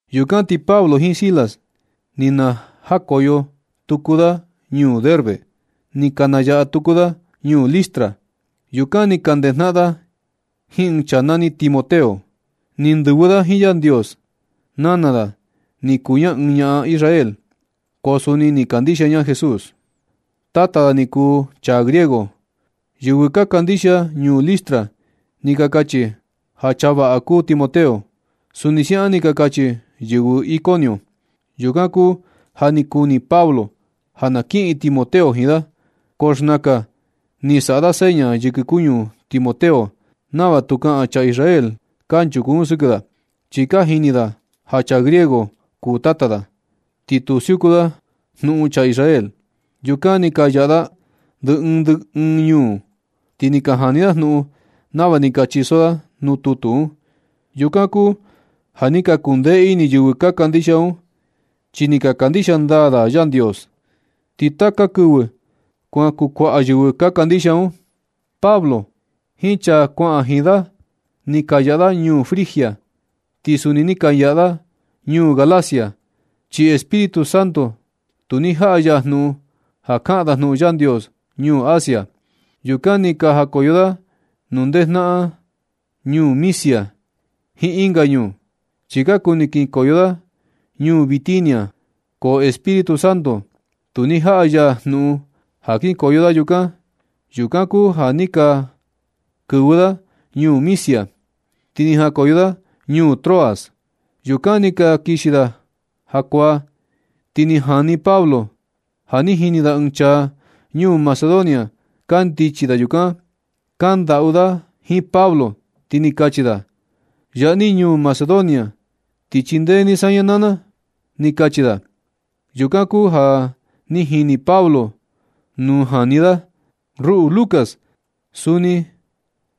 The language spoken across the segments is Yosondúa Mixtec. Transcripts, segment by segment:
Yukan ti Pablo jiin Silas ni na jakoyo tuku da ñuu Derbe. Ni ka nayaꞌa tuku da ñuu Listra. Yukan ni ka ndejnaꞌan da jiin ɨɨn chaa nani Timoteo. Ni ndɨvɨ da jiin Yandios. Nana da ni kuu ña ɨɨn ñaꞌan Israel, ko suni ni kandixia ña Jesús. Tata da ni kuu chaa griego. Yɨvɨ ka kandixia ñuu Listra ni ka kachi ja chaa vaꞌa kuu Timoteo. Suni siaꞌan ni ka kachi yɨvɨ Iconio. Yukan kuu ja ni kuni Pablo ja na kiꞌin Timoteo jiin da, ko xnakan ni saꞌa da seña yɨkɨ kuñu Timoteo nava tu kaꞌan chaa Israel kanchuku un sɨkɨ da, chi ka jini da ja chaa griego kuu tata da, ti tu siuku da jnuꞌun chaa Israel. Yukan ni ka yaꞌa da ndɨ ɨɨn ndɨ ɨɨn ñuu un, ti ni ka jani dajnuꞌun nava ni ka chiso da nuu tutu un. Yukan kuu ja ni ka kundee ini yɨvɨ ka kandixia un, chi ni ka kandixia ndaa da Yandios. Ti taka kɨvɨ kuan kukuaꞌa yɨvɨ ka kandixia un. Pablo jiin chaa kuaꞌan jiin da, ni ka yaꞌa da ñuu Frigia, ti suni ni ka yaꞌa da ñuu Galacia, chi Espíritu Santo tu ni jaꞌa ya jnuꞌun ja kaꞌan da jnuꞌun Yandios ñuu Asia. Yukan ti na jakoyo da nuu ndejnaꞌan ñuu Misia jiin ɨnga ñuu, chi ka kuni kinkoyo da ñuu Bitinia, ko Espíritu Santo tu ni jaꞌa ya jnuꞌun ja kinkoyo da yukan. Yukan kuu ja ni ka kɨvɨ da ñuu Misia, ti ni jakoyo da ñuu Troas. Yukan ni ka kixi da jakuaa, ti ni jani Pablo ja ni jini da ɨɨn chaa ñuu Macedonia kandichi da yukan. Kndaꞌu da jiin Pablo, ti ni kachi da: ―Yaa ni ñuu Macedonia, ti chindee ni saña naa na ―ni kachi da. Yukan kuu ja ni jini Pablo nuu jani da. Ruꞌu Lucas suni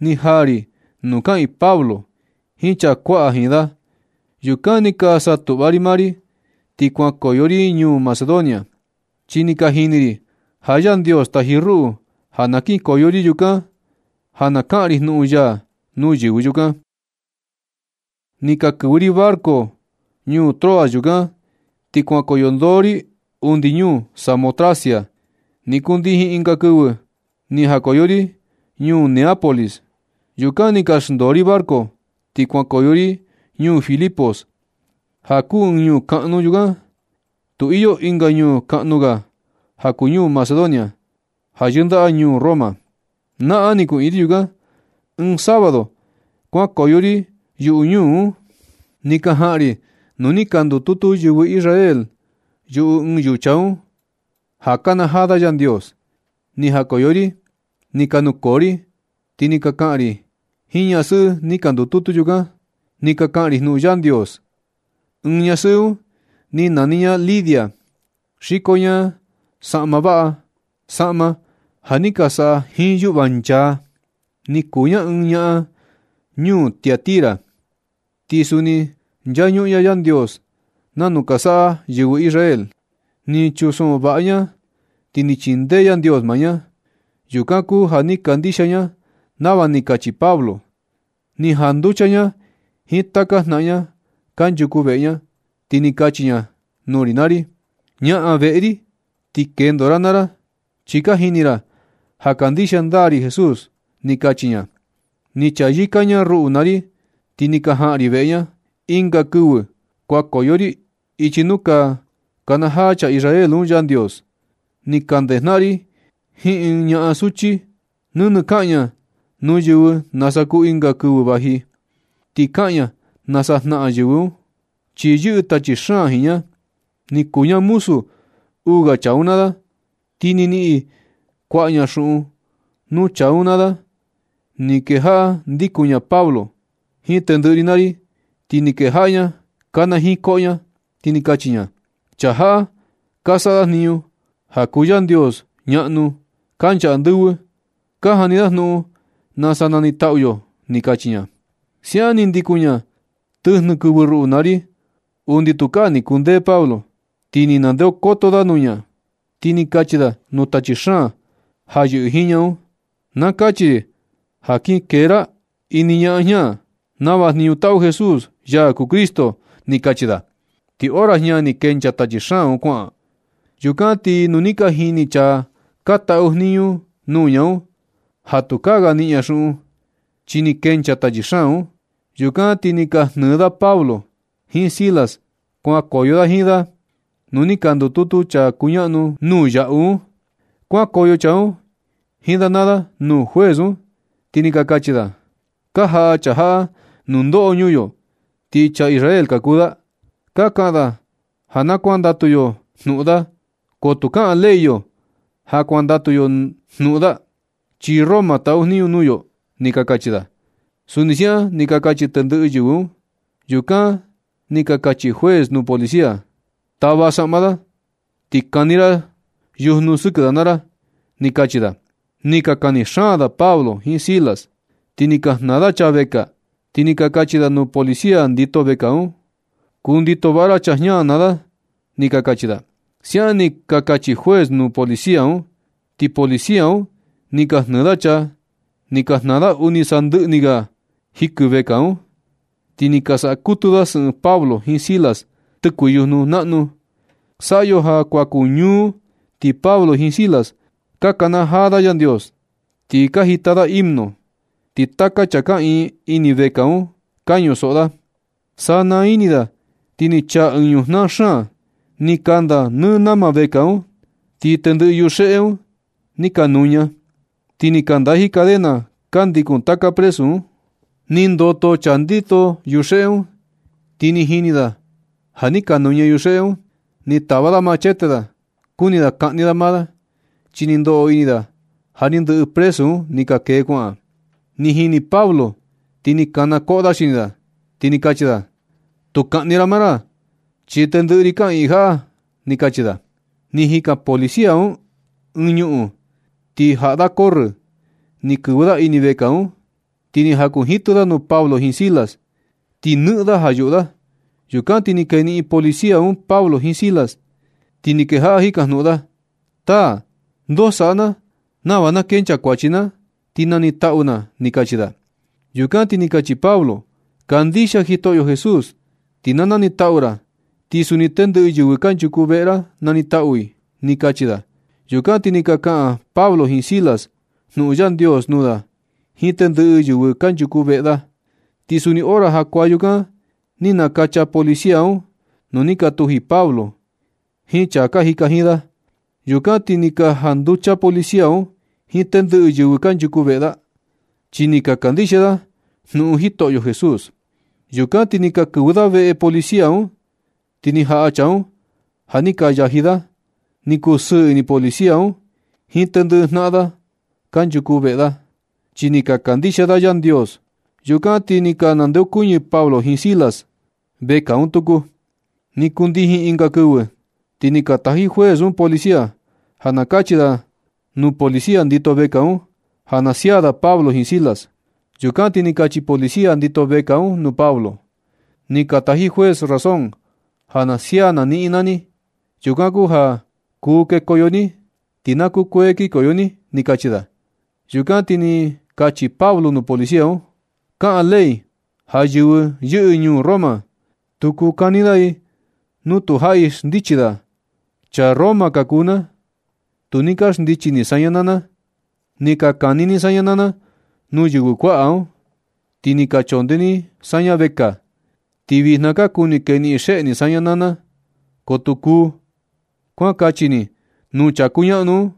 ni jaa ri nuu kaꞌiin Pablo jiin chaa kuaꞌan jiin da. Yukan ni ka saꞌa tuꞌva ri maa ri, ti kuankoyo ri ñuu Macedonia, chi ni ka jini ri ja Yandios taji ruꞌu ja na kinkoyo ri yukan, ja na kaꞌan ri jnuꞌun ya nuu yɨvɨ yukan. Ni ka kɨvɨ ri barco ñuu Troas yukan, ti kuankoyo ndoo ri undi ñuu Samotracia. Ni kundijin ɨnga kɨvɨ, ni jakoyo ri ñuu Neápolis. Yukan ni ka xndoo ri barco ti kuankoyo ri ñuu Filipos, ja kuu ɨɨn ñuu kaꞌnu yukan. Tu iyo ɨnga ñuu kaꞌnu ga ja kuu ñuu Macedonia un ja yɨndaꞌa ñuu Roma. Naꞌan ni kuꞌiin ri yukan. Ɨɨn sábado kuankoyo ri yuꞌu ñuu un, ni ka jaꞌan ri nuu ni ka ndututu yɨvɨ Israel yuꞌu ɨɨn yucha un, ja kanajaa da Yandios. Ni jakoyo ri, ti ni ka nukoo ri, ti ni ka kaꞌan ri jiin ñasɨꞌɨ ni ka ndututu yukan. Ni ka kaꞌan ri jnuꞌun Yandios. Ɨɨn ñasɨꞌɨ un ni nani ña Lidia. Xiko ña saꞌma vaꞌa, saꞌma ja ni ka saꞌa jiin yuꞌva nchaa. Ni kuu ña ɨɨn ñaꞌan ñuu Tiatira, ti suni ni nchañuꞌun ña Yandios nanu ka saꞌa yɨvɨ Israel. Ni chunsoꞌo vaꞌa ña, ti ni chindee Yandios maa ña. Yukan kuu ja ni kandixia ña nava ni kachi Pablo. Ni janducha ña jiin taka jnaꞌan ña kanchuku veꞌe ña, ti ni kachi ña nuu ri naa ri: ―Ñaꞌan veꞌe ri, ti kendo ra naa ra, chi ka jini ra ja kandixia ndaa ri Jesús ―ni kachi ña. Ni chayɨka ña ruꞌu naa ri, ti ni ka jaꞌan ri veꞌe ña. Ɨnga kɨvɨ kuankoyo ri ichi nuu ka kanajaa chaa Israel un Yandios. Ni ka ndejnaꞌan ri jiin ɨɨn ñaꞌan suchi. Nɨnɨ kaꞌan ña nuu yɨvɨ nasa kuu ɨnga kɨvɨ vaji, ti kaꞌan ña nasa jnaꞌan yɨvɨ un, chi yɨꞌɨ tachi xaan jiin ña. Ni kuu ña muzu uu ga chaa un naa da, ti ni niꞌin kuaꞌa ña xuꞌun nuu chaa un naa da. Ni kejaꞌa ndikun ña Pablo jiin tendɨꞌɨ ri naa ri, ti ni kejaꞌa ña kanajiin koꞌo ña, ti ni kachi ña: ―¡Chaa jaꞌa ka saꞌa da jniñu ja kuu Yandios ñaꞌnu kancha andɨvɨ! ¡Ka jani da jnuꞌun nasa nanitaꞌu yo! ―ni kachi ña. Siaꞌan ni ndikun ña tɨjnɨ kɨvɨ ruꞌu naa ri undi tukaa ni kundee Pablo. Ti ni ndeokoto da nuu ña, ti ni kachi da nuu tachi xaan ja yɨꞌɨ jiin ña un: ―Na kachi ri ja kin kee ra ini ñaꞌan jña, nava jniñu taꞌu Jesús, ya kuu Cristo ―ni kachi da. Ti hora jña ni kenchaa tachi xaan un kuaꞌan. Yukan ti nu ni ka jini chaa ka taꞌu jniñu nuu ña un, ja tukaa ga niꞌin ña xuꞌun, chi ni kenchaa tachi xaan un. Yukan ti ni ka jnɨɨ da Pablo jiin Silas kuankoyo da jiin da nuu ni ka ndututu chaa ka kuñaꞌnu nuu yaꞌu un. Kuankoyo chaa un jiin da naa da nuu juez un, ti ni ka kachi da: ―Ka jaꞌa chaa jaꞌa nundoꞌo ñuu yo, ti chaa Israel ka kuu da. Ka kaꞌan da ja na kuandatu yo jnuꞌun da, ko tu kaꞌan ley yo ja kuandatu yo jnuꞌun da, chi Roma taꞌu jniñu nuu yo ―ni ka kachi da. Suni siaꞌan ni ka kachi tendɨꞌɨ yɨvɨ un. Yukan ni ka kachi juez nuu policía: ―Tava saꞌma da, ti kani ra yujnu sɨkɨ da naa ra ―ni ka kachi da. Ni ka kani xaan da Pablo jiin Silas, ti ni ka jnaa da chaa vekaa, ti ni ka kachi da nuu policía ndito vekaa un: ―Kundito vaꞌa ra chaa jña naa da ―ni ka kachi da. Siaꞌan ni ka kachi juez nuu policía un, ti policía un ni ka jnɨɨ da chaa, ti ni ka jnaa da undi sandɨꞌɨ ni ga jikɨ vekaa un. Ti ni ka saꞌa kutu da sɨꞌɨn Pablo jiin Silas tɨkuɨ yujnu naꞌnu. Saꞌa yo ja kuan kuu ñuu, ti Pablo jiin Silas ka kanajaa da Yandios, ti ka jita da himno. Ti taka chaa kaꞌiin ini vekaa un ka ñusoꞌo da. Sana ini da ti ni chaa ɨɨn ñujnaa xaan. Ni kanda nɨ nama vekaa un, ti tendɨꞌɨ yuxeꞌe un ni ka nuña, ti ni ka ndaji cadena ka ndikun taka presu un. Ni ndoto chaa ndito yuxeꞌe un, ti ni jini da ja ni ka nuña yuxeꞌe un. Ni tava da machete da. Kuni da kaꞌni da maa da, chi ni ndoꞌo ini da ja ni ndɨꞌɨ presu un ni ka kee kuaꞌan. Ni jini Pablo ti ni kana koꞌo da xini da, ti ni kachi da: ―Tu kaꞌni ra maa ra, chi tendɨꞌɨ ri kaꞌiin jaꞌa ―ni kachi da. Ni jikan policía un ɨɨn ñuꞌun, ti jaꞌa da corrɨ ni kɨvɨ da ini vekaa un, ti ni jakunjitɨ da nuu Pablo jiin Silas. Ti nɨꞌɨn da ja yuꞌu da. Yukan ti ni keniꞌin policía un Pablo jiin Silas, ti ni kejaꞌa jikajnuꞌun da: ―Taa, ndoo saꞌa na nava na kenchaa kuachi na, ti nanitaꞌu na ―ni kachi da. Yukan ti ni kachi Pablo: ―Kandixia Jitoꞌyo Jesús ti na nanitaꞌu ra, ti suni tendɨꞌɨ yɨvɨ kanchuku veꞌe ra nanitaꞌu i ―ni kachi da. Yukan ti ni ka kaꞌan Pablo jiin Silas jnuꞌun Yandios nuu da jiin tendɨꞌɨ yɨvɨ kanchuku veꞌe da. Ti suni hora jakuaa yukan ni nakacha policía un nuu ni ka tuji Pablo jiin chaa ka jika jiin da. Yukan ti ni ka janducha policía un jiin tendɨꞌɨ yɨvɨ kanchuku veꞌe da, chi ni ka kandixia da jnuꞌun Jitoꞌyo Jesús. Yukan ti ni ka kɨvɨ da veꞌe policía un, ti ni jaꞌa chaa un ja ni ka yaji da. Ni kusɨɨ ini policía un jiin tendɨꞌɨ jnaꞌan da kankuchu veꞌe da, chi ni ka kandixia da Yandios. Yukan ti ni ka nandeokuñɨ Pablo jiin Silas vekaa un tuku. Ni kundijin ɨnga kɨvɨ, ti ni ka taji juez un policía ja na kachi da nuu policía ndito vekaa un ja na sia da Pablo jiin Silas. Yukan ti ni kachi policía ndito vekaa un nuu Pablo: ―Ni ka taji juez razón ja na sia na niꞌin naa ni. Yukan kuu ja kuu kekoyo ni, ti na kukuee kinkoyo ni ―ni kachi da. Yukan ti ni kachi Pablo nuu policía un: ―Kaꞌan ley ja yɨvɨ yɨꞌɨ ñuu Roma, tu kuu kani da i nu tu jaꞌi xndichi da. Chaa Roma ka kuu na. Tu ni ka xndichi ni saña naa na. Ni ka kani ni saña naa na nuu yɨvɨ kuaꞌa un, ti ni ka chondee ni saña vekaa. Ti vijna ka kuni keniꞌin xeꞌe ni saña naa na. Ko tu kuu. Kuan kachi ni nuu chaa kuñaꞌnu un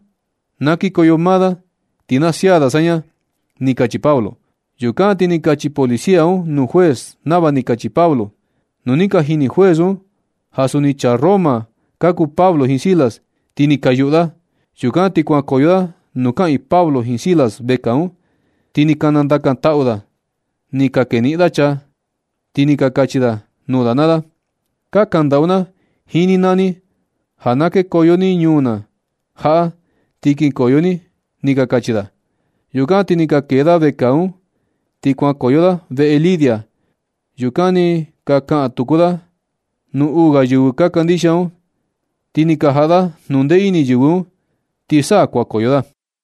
na kikoyo maa da, ti na sia da saña ―ni kachi Pablo. Yukan ti ni kachi policía un nuu juez nava ni kachi Pablo. Nu ni ka jini juez un ja suni chaa Roma ka kuu Pablo jiin Silas, ti ni ka yuꞌu da. Yukan ti kuankoyo da nuu kaꞌiin Pablo jiin Silas vekaa un, ti ni ka nandakan taꞌu da nuu da. Ni ka keniꞌin da chaa, ti ni ka kachi da nuu da naa da: ―Ka kandaꞌu na jiin ni naa ni, ja na kekoyo ni ñuu na jaꞌa ti kinkoyo ni ―ni ka kachi da. Yukan ti ni ka kee da vekaa un, ti kuankoyo da veꞌe Lidia. Yukan ni ka kaꞌan tuku da nuu uu ga yɨvɨ ka kandixia un, ti ni ka jaꞌa da jnundee ini yɨvɨ un, ti sa kuankoyo da.